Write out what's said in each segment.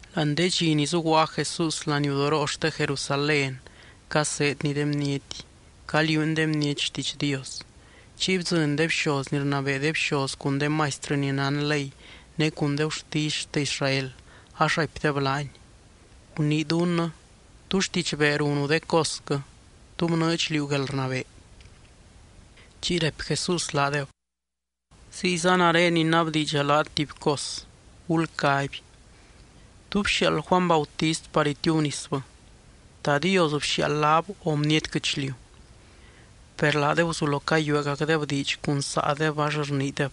Láani de dxi ni zuguaa Jesús laniudoroo xte Jerusalén, caseedny de bniety, caliuuny de bniety xtiidx Dios. Chiy bdzɨny de bxoz ni rnabee de bxoz cun de maistrɨ ni nán ley, ne cun de gurtisy xte Israel, ax raipdeb laany: —Gunii dunnɨ, ¿tú xtidxbee runu de cosquɨ? ¿Tú bnɨɨdx liú guelrnabee? Chiy raipy Jesús laadeb: —Ziyza nare inabdiidxa laat tuby cos. Gulcaby, ¿tú bxiaald Juany Bautist par itiubnisbɨ? ¿Ta Dios bxiaald laab o bniety guɨchliu? Per laadeb guzulo cayueegacdeb diidx cun saadeb ax rniideb: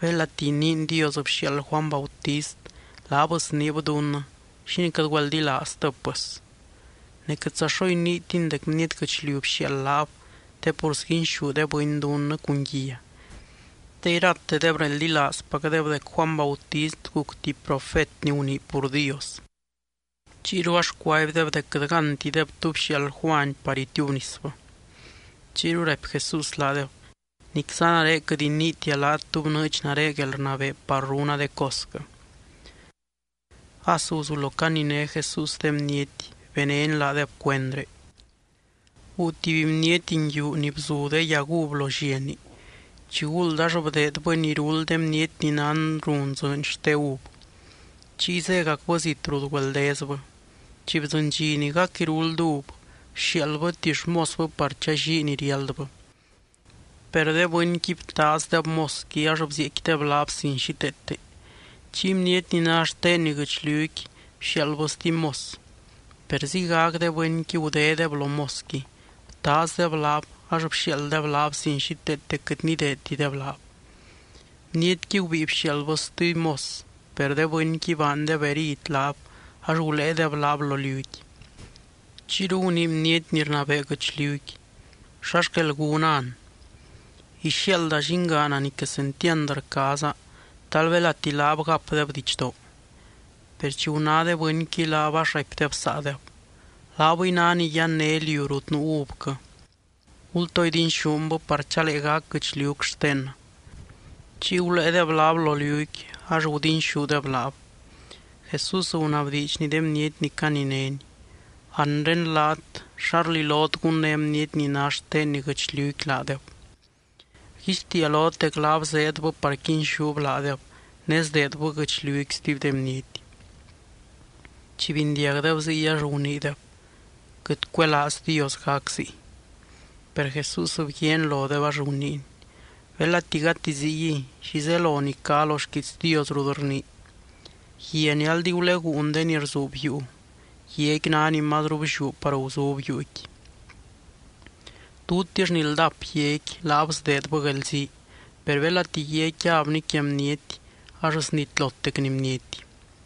“Belati iniin Dios bxiaald Juany Bautist, laab sniib dunnɨ, ¿xínii quɨt güeldilaaztɨb, pɨs?” Ne quɨtza xo iniitin dec bniety guɨchliu bxiaald laab te pur sguinxú de bɨny dunnɨ cun guia, te iratedeb reldilaazpacdeb dec Juany Bautist guc tuby profet ni gunii pur Dios. Chiyru ax cuaibdeb dec quɨt gántideb tú bxiaald Juany par itiubnisbɨ. Chiyru raipy Jesús laadeb: —Nicza nare quɨt iniitia laat tú bnɨɨdx nare guelrnabee par runa de cosquɨ. As guzulo caniné Jesús de bniety, benény laadeb cuendré: —Guu tuby bniety nguiu ni bzu de yag uv lo lliani, chiguld ax bdeedbɨni iruld de bniety ni nán run dzɨɨny xte uv. Chiy zégacbɨ zit rut güeldezbɨ. Chi bdzɨny dxi ni gac iruld uv, bxiaaldbɨ tuby xmosbɨ par challii ni riáldbɨ. Per de bɨnqui btaazdeb mosqui ax bzieecquideb laab sin xíteete. Chiy bniety ni ná xtenni guɨchliuqui bxiaaldbɨ stuby mos. Per ziygac de bɨnqui gudédeb lo mosqui, btaazdeb laab ax bxiaalddeb laab sin xíteete quɨt nideedtideb laab. Bnietqui gubíi bxiaaldbɨ stuby mos, per de bɨnqui baandeb herid laab ax guléedeb laab lo liuqui. ’Chiyru gunii bniety ni rnabee guɨchliuqui: “¿Xa xquel gúna an? Ixiaalda llingaana ni quesentiand rcaaza. Talbelati laab gapdeb didxdoo.” Per chi guná de bɨnqui laab, ax raipdeb saadeb: “Laabɨy ná ni yanné liu rut nuu uvquɨ. Gultoo idinxúnbɨ, par chalee gac guɨchliuc xtennɨ.” Chiy guléedeb laab lo liuqui ax gudinxúdeb laab. Jesús gunabdiidxny de bniety ni caninény: —Anre laat, ¿xa rlilot gunné bniety ni ná xtenni guɨchliuqui laadeb? Rguixtiia lot dec laab zeedbɨ par quinxúb laadeb ne sdeedbɨ guɨchliuqui stuby de bniety. Chi bindiagdeb ziy ax guniideb: —¡Quɨt cuelaaz Dios gac ziy! Per Jesús bguiaany lodeb ax guniiny: —Belati gati ziguiy, ¿xi zelo ni cá lo xquiits Dios rut rnii?: Guia ni aldi guleguun de ni rzuub yuu, guiaqui ná ni mazru blliú par guzub yuuqui. Tutix ni ldap guiaqui, laab sdeedbɨ guelzii. Per belati guiaqui yabni quia bniety ax snitlotecni bniety.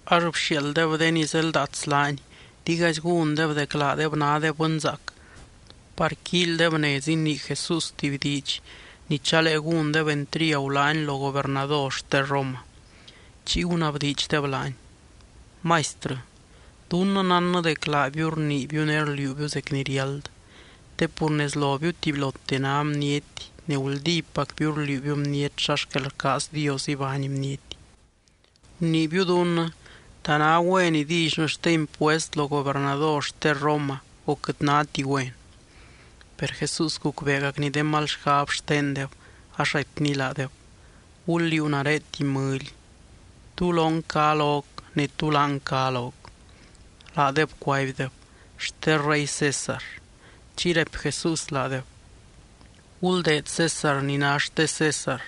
Ax bxiaalddeb de ni zeldaats laany, digaizy gúndeb dec laadeb nádeb bɨnzaac, par quíilydeb nez inii Jesús tuby diidx ni chalee gúndeb entriagu laany lo gobernador xte Roma. Chiy gunabdiidxdeb laany: —Maistrɨ, dunnɨ nánnɨ dec laabiu rniibiu ne rliuubiu zec ni riáld. Te pur nez lobiu tubylote ná bniety ne guldípacbiu rliuubiu bniety xa xquel rcaaz Dios ibány bniety. Guniibiu dunnɨ, ¿ta ná güen idillynɨ xte impuest lo gobernador xte Roma, o quɨt náti güen? Per Jesús gucbeegacny de mal xgab xtendeb ax raipny laadeb: —Gul liuu nare tuby mɨly. ¿Tú lon cá loc, ne tú láng cá loc? Laadeb cuaibdeb: —Xte rey César. Chiy raipy Jesús laadeb: —Guldeed César ni ná xte César,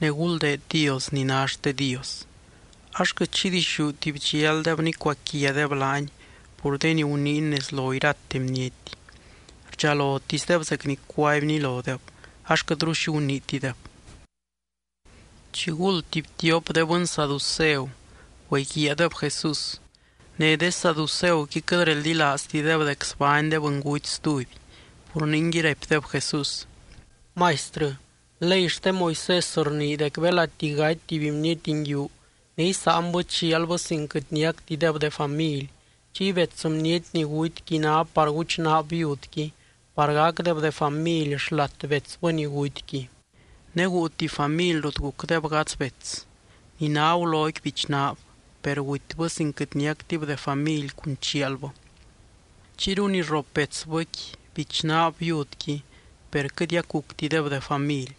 ne guldeed Dios ni ná xte Dios. Ax quɨt xi dixúti bdxialdeb nicuaquiadeb laany pur de ni guniiny nez lo irate bniety. Rdxalotisdeb zec ni cuaibny lodeb, ax quɨtru xi guniitideb. Chiguld tuby tiop de bɨny saduceu güeguiaadeb Jesús. Ne de saduceuqui quɨt reldilaaztideb dec sbány de bɨnguty stuby. Pur ningui raipdeb Jesús: —Maistrɨ, ley xte Moisés rnii dec belati gaty tuby bniety nguiu ne isáanbɨ chialbɨ sin quɨt niactideb de family, chiy bets bniety ni gutyqui ná par guchnaab viudqui par gacdeb de family xlat betsbɨ ni gutyqui. Ne guu tuby family rut gucdeb gadz bets. Ni ná guloqui bichnaab, per gutybɨ sin quɨt niactib de family cun chialbɨ. Chiyru ni rrop betsbɨqui bichnaab viudqui per quɨtiac guctideb de family.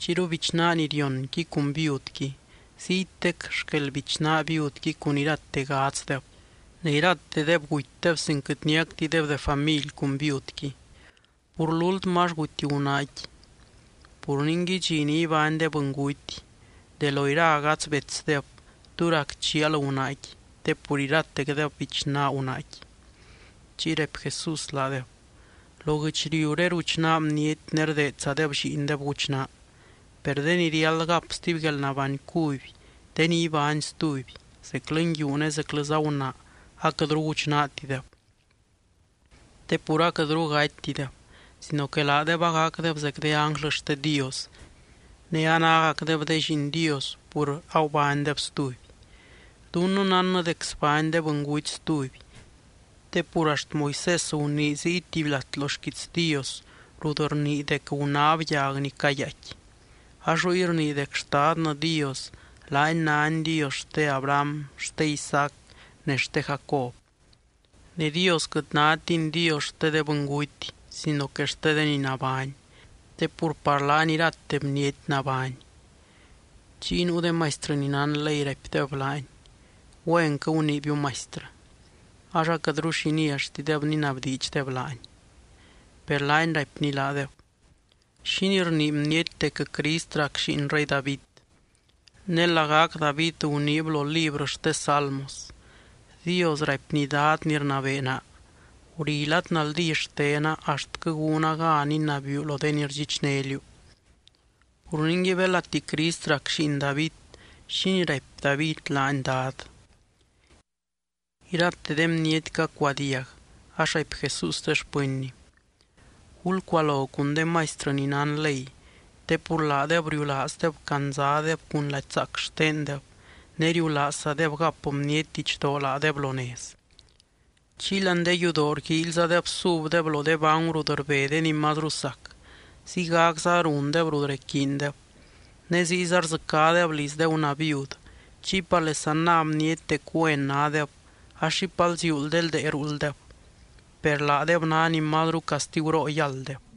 Chiyru bichnaa ni rionqui cun viudqui, ziytec xquel bichnaa viudqui cun irate gadzdeb, ne iratedeb gutydeb sin quɨt niactideb de family cun viudqui. Pur lúltmɨ ax guty gunaaqui. Pur ningui dxi ni ibány de bɨnguty, ¿de lo ira gadz betsdeb tú rac chial gunaaqui te pur iratecdeb bichnaa gunaaqui? Chiy raipy Jesús laadeb: —Lo guɨchliuré ruchnaa bniety ne rdeedzadeb lliindeb guchnaa. Per de ni riáld gap stuby guelnabány cuby de ni ibány stuby, zeclɨ nguiu ne zeclɨza gunaa aquɨtru guchnaatideb. Te pur aquɨtru gatytideb, sino que laadeb agacdeb zec de ánglɨ xte Dios, ne anágacdeb de lliin Dios pur agubánydeb stuby. Dunnɨ nánnɨ dec sbány de bɨnguty stuby. Te pur axt Moisés gunii ziy tuby lat lo xquiits Dios rut rnii dec gunáb yag ni cayaaicqui. Ax ruy rnii dec Xtadnɨ Dios, laany nány Dios xte Abraham, xte Isaac, ne xte Jacob. Ne Dios quɨt nátiny Dios xte de bɨnguty, sino que xte de ni nabány, te pur par laany irate bniety nabány. Chiy nuu de maistrɨ ni nán ley raipdeb laany: —Güenquɨ guniibiu Maistrɨ. Ax aquɨtru xi nialltideb ninabdiidxdeb laany. Per laany raipny laadeb: —¿Xínii rnii bniety dec Crist rac lliin rey David? Ne lagac David guniib lo librɨ xte Salmos: Dios raipny Dad ni rnabee naa: “Guri lad naldí xtena axtquɨ gúna gan inabiiu lo de ni rdxichné liú.” Pur ningui belati Crist rac lliin David, ¿xínii raipy David laany, Dad? Irate de bniety cacuadiag, ax raipy Jesús de xpɨnny: —Gulcualo cun de maistrɨ ni nán ley. Te pur laadeb riulaazdeb candzadeb cun lady zaac xtendeb, ne riulaazzadeb gap bniety didxdoo laadeb lo nez. Chiy láani de yudoo rguíilyzadeb subdeb lo de bangu rut rbe de ni mazru sac, ziygacza rundeb rut requiindeb. Ne ziyza rdzɨcádeb liz de gunaa viud chiy parlesa ná bniety dec güen nádeb, ax xipal ziuul de ldee ruulddeb. Per laadeb ná ni mazru castiguroo yálddeb.